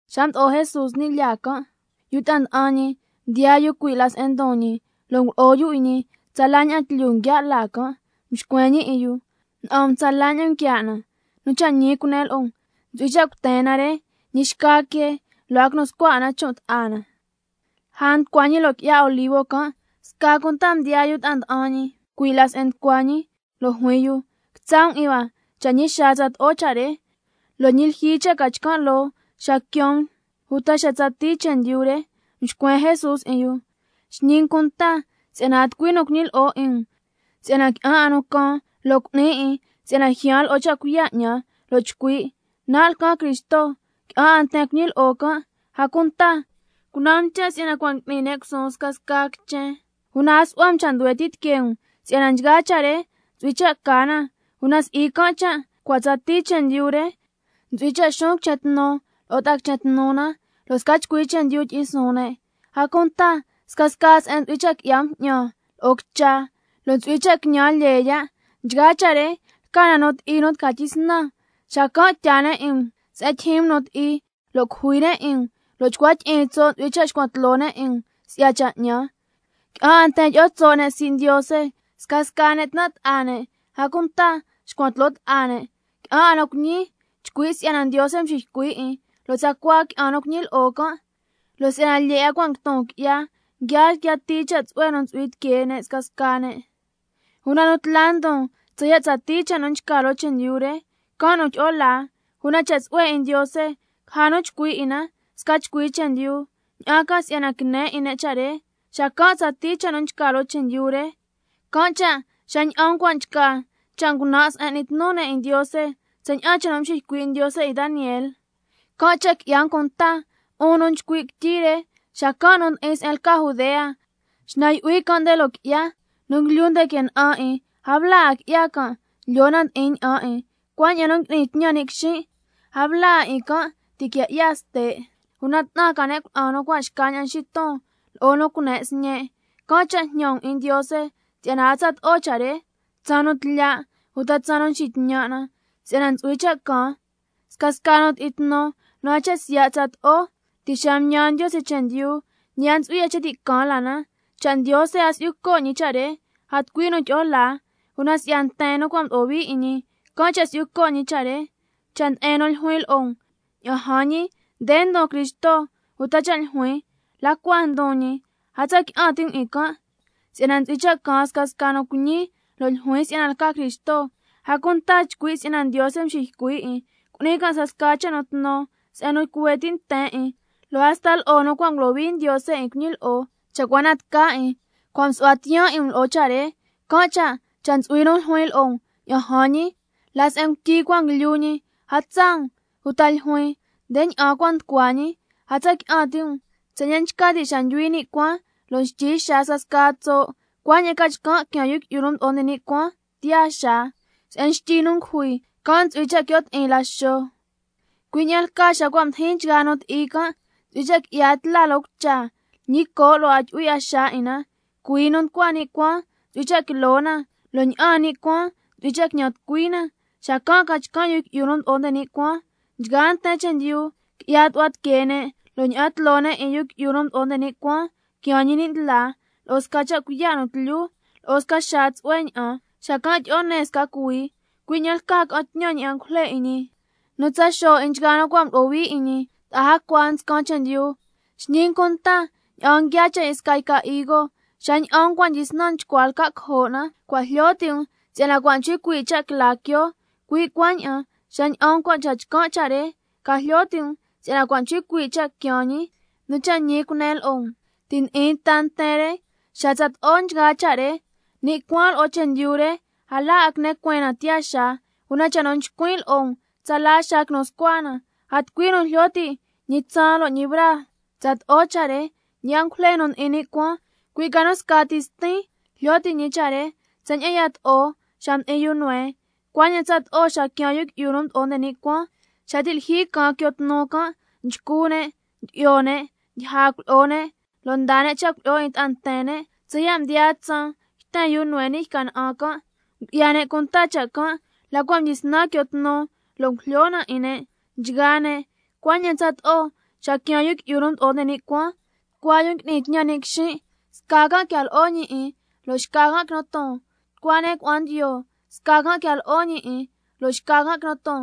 Xa mdo'o Jesús ni' lyaa can', yu ta'a nda'an ñi mdiyaa yu cui' la se'en ndon ñi, lo' ngulo'o yu 'in ñi tsala ña'an tlyu nguiaa' laa can'. Mxcuen ñi 'in yu: ¡Na'an um tsala ña'an nguiaa' na! Nu cha' ñi cunen lo'o um, ntsu'hui cha' cuten na re, ñi xca quee lo' a quinu scua 'a na chon' ta'a na. Lja nducua ñi loo qui'ya Olivo can', sca cunta mdiyaa yu ta'a nda'an ñi cui' la se'en nducua ñi, lo' juin yu: Quitsa' um 'in hua cha' ñi xaa tsato'o cha' re, lo' ñi lyijyi cha' ca chcan' loo xa quiaan um uta xa tsatii chendyu re. Mxcuen Jesús 'in yu: Xñi um cunta si'yana a tucui nu cuñilyi'o 'in um. Si'yana qui'an 'a nu caan, lo' cu'ni 'in si'yana ljyaan lo'o cha' cuiya' 'ñan, lo' chcui': Nan' lcan Cristo. Qui'an 'a nten cuñilyi'o can'. A cunta cunan um cha' si'yana cua' ngui'ni ne' cusuun se'en tijyo' lo'o se'en cui' ti, una a su'hua um cha' nduhue ti' tiquee um si'yana nchgaa cha' re ntsu'hui cha' ca na, una si'i can' cha' cua' tsatii chendyu re. Ntsu'hui cha' xuun quichen tnu lo'o ta'a quichen tnu na, lo' sca chcui chendyu tyi'in suun ne'. A cunta scasca se'en ntsu'hui cha' qui'ya bju'ñan lo'o quicha, lo' ntsu'hui cha' quiñan lyee ya'. Nchgaa cha' re lca nu ti'i nu tca tyisnan. Xacan' tyaa ne' 'in um se'en tyijyin um nu ti'i, lo' cujui ne' 'in um, lo' chcua tyi'iin tso' ntsu'hui cha' xcuan tloo ne' 'in um si'ya cha' 'ñan. Qui'an 'a nten tyi'o tso' ne' sii' Ndiose, scasca ne' tnan' ta'a ne', a cunta xcuan tloo ta'a ne'. Qui'an 'a nu cuiñi chcui' si'yana Ndiose nxiycui' 'in, lo' tsacua qui'an nu cuñilyi'o can'. Lo' si'yana lyee 'a cua' yton qui'ya, nguiaa ndiyatii cha' tsu'hue nu ntsu'hui tiquee ne' scasca ne'. Una nu tla ndon hasta ya' tsatii cha' nu nchca loo chendyu re, can' nu tyi'o laa. Una cha' tsu'hue 'in Ndiose caja nu chcui' 'in na sca chcui chendyu, ña'an ca si'yana ca cuiya' ti' ne' cha' re, xacan' tsatii cha' nu nchca loo chendyu re. Can' cha' xa ña'an um cua' nchca —cha' ngunan' se'en n'ni tnu ne' 'in Ndiose—, tsaña'an cha' nu mxiycui' Ndiose 'in Daniel (can' cha' qui'ya um cunta, 'un nu nchcui' quityi re). Xacan' nu ndi'in se'en lca Judea, xnan yu'hui can' nde loo qui'ya. Nu nguilyu nde que na'an 'in, a bla 'a qui'ya can' lyoo na ndi'in ña'an 'in. Cuaña'an nu ngui'ni tñan ni' quixin', a bla 'a 'in can' ti' quia 'ya ste'. Una 'tnan ca ne' cuna'an nu cua' xcaña'an nxiton, lo'o nu cune' sñe'. Can' cha' jñan um 'in Ndiose si'yana a tsato'o cha' re tsaan nu tlya', uta tsaan nu nxitñan' na, si'yana ntsu'hui cha' caan —scasca nu ti'i tnu nu a nchca siya' tsato'o ti' xa mtñan Ndiose chendyu, ñi a ntsu'hui 'a cha' ti' caan la na—. Cha' Ndiose a si'yu co' ñi cha' re, a tucui nu tyi'o laa, una si'ya nten nu cua' mdo'o hui 'in ñi, can' cha' si'yu co' ñi cha' re. Cha' nde'en nu ljuin lo'o um: Ña'an jan ñi, nde ndon Cristo, uta cha' ljuin: La cua ndon ñi. A tsa qui'an ti' um 'in can'. Si'yana ntsu'hui cha' caan scasca nu cuiñi lo' ljuin si'yana lca Cristo, a cunta chcui' si'yana Ndiose nxiycui' 'in, lo' cu'ni can' scasca cha' nu tnu se'en nu cuhue ti' nten 'in, lo' hasta lo'o nu cua' ngulohui Ndiose 'in cuñilyi'o, cha' cua na tca 'in. Cua' msu'hua tiyaan 'in um lo'o cha' re. Can' cha', cha' ntsu'hui nu ljuin lo'o um: Ña'an jan ñi, la se'en ngutyi cua nguilyu ñi, a tsaa um. Uta ljuin: Nde ña'an cua nducua. A tsa qui'an ti' um. Tsaña'an nchca ti' xa ndyuhui ni' cuaan, lo' nxtyi xaa scasca tso', cuaña'an ca chcan' quiaan Yu Qui'yu nu Mdo'o nde ni' Cuaan tiyaa xaa. Se'en xtyi nu ngujui, can' ntsu'hui cha' quio' ti'in laxo. Cui' ña'an lcaa xa cua' mdijin nchgaa nu ti'i can', —ntsu'hui cha' qui'ya tla loo cucha, ñi coo' lo' a tyu'hui 'a xaa 'in na, cuii nu nducua ni' cuaan ntsu'hui cha' quilo na, lo' ña'aan ni' cuaan ntsu'hui cha' quiñan tucui na—. Xacan' ca chcan' loo Yu Qui'yu nu Mdo'o nde ni' Cuaan. —Nchgaa nten chendyu qui'ya tu'hua tiquee ne'—, lo' ña'an tloo ne' 'in —Yu Qui'yu nu Mdo'o nde ni' Cuaan quiaan ñi ni' ndlaa— lo'o sca cha' cuiya' nu tlyu, lo'o sca xaa tsu'hue ña'an. Xacan' tyi'o ne sca cuhuii, cui' ña'an lcaa ca'an tñan ñi angujle 'in ñi, nu tsa xo' 'in nchgaa nu cua' mdo'o hui 'in ñi ta'a jacua nscan chendyu. Xñi um cunta ña'an nguiaa cha' 'in sca yca higo: Xa ña'an um cua' tyisnan chcua lca' cojo' na, cua' jlyo ti' um si'yana cua' nchcui cuii' cha' quila quioo. Cui' cuaña'an xa ña'an um cua' nchca nchgaa cha' re, ca jlyo ti' um si'yana cua' nchcui cuii' cha' quiaan ñi. Nu cha' ñi cunen lo'o um, ti' ndi'in ta nten re xa tsato'o nchgaa cha' re. Ni' cuaan lo'o chendyu re, a la 'a quine cueen na tiyaa xaa, una cha' nu nchcuin' lo'o um, tsala xaa quinu scua na. A tucui nu jlyo ti' ñi tsaan lo' ñi braa tsato'o cha' re, ñi angujle nu ndi'in ni' cuaan, cui' ca nu scati Stin jlyo ti' ñi cha' re. Tsaña'an yato'o xa mdi'in yu Noé, cuaña'an tsato'o xa quiaan Yu Qui'yu nu Mdo'o nde ni' Cuaan. Xa ti' lyijyi caan quio tnu can', nchcu ne', ndyi'yo ne', ndyija cuilyi'o ne', lo' ndaa ne' cha' cuilyi'o 'in ta'a nten ne', tsaya' mdiyaa tsaan yten yu Noé ni' yca na'an can'. Ngu'ya ne' cunta cha' can' la cua' mdyisnan quio tnu lo' ngujlyo na 'in ne' nchgaa ne', cuaña'an tsato'o xa quiaan Yu Qui'yu nu Mdo'o nde ni' Cuaan. Tucua yu ngui'ni tñan ni' quixin', sca can' quia lo'o ñi 'in, lo' xca can' quinu ton. Tucua ne' cuna'an ndiyo, sca can' quia lo'o ñi 'in, lo' xca can' quinu ton.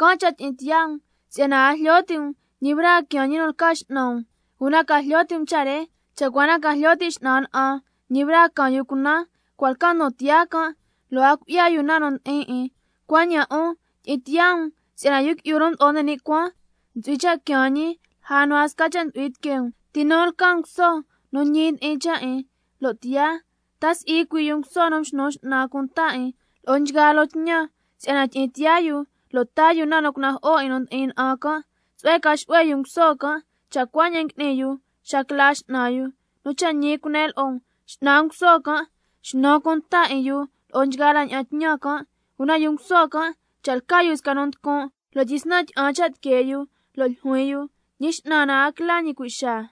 Can' cha' tyi'in tiyaa um, si'yana a jlyo ti' um ñi braa quiaan Ñi nu lca X'nan um. Una ca jlyo ti' um cha' re: Cha' cua na ca jlyo ti' x'nan na'an ñi braa caan yu cunan, cua' lca ndon tiyaa can', lo' a cui'ya yu na nu ndi'in 'in. Cuaña'an 'un, tyi'in tiyaa um, si'yana Yu Qui'yu nu Mdo'o nde ni' Cuaan ntsu'hui cha' quiaan ñi lja nu a sca cha' ntsu'hui tiquee um. ¿Ti nu lca nguso nu ñi ndi'in cha' 'in lo' tiyaa? Ta si'i cui' yu nguso nu mxnu x'nan cunta 'in lo'o nchgaa loo tñan, si'yana tyi'in tiyaa yu lo' taa yu na nu cunajo'o 'in nu ndi'in na'an can'. Tsu'hue ca xu'hue yu nguso can', cha' cuaña'an ngui'ni yu xa quila x'nan yu. Nu cha' ñi cunen lo'o um, x'nan nguso can' xnu cunta 'in yu lo'o nchgaa la ña'an tñan can'. Una yu nguso can', cha' lca yu sca nu nducun' lo' tyisnan tyi'an cha' tiquee yu, lo' ljuin yu: Ñi x'nan a quila ñi cui' xaa,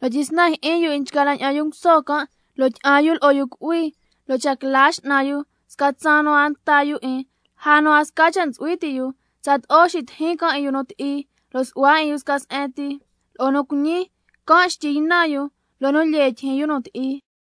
lo' tyisnan jyi'in yu 'in nchgaa la ña'an yu nguso can', lo' tyi'an yu lo'o yu cu'hui, lo' cha' quila x'nan yu sca tsaan nu a nta yu 'in, lja nu a sca cha' ntsu'hui ti' yu, tsaloo ti xitijin can' 'in yu nu ti'i, lo' su'hua 'in yu sca se'en ti lo'o nu cuiñi, can' xtyi ynan yu loo nu lyee tyijyin yu nu ti'i.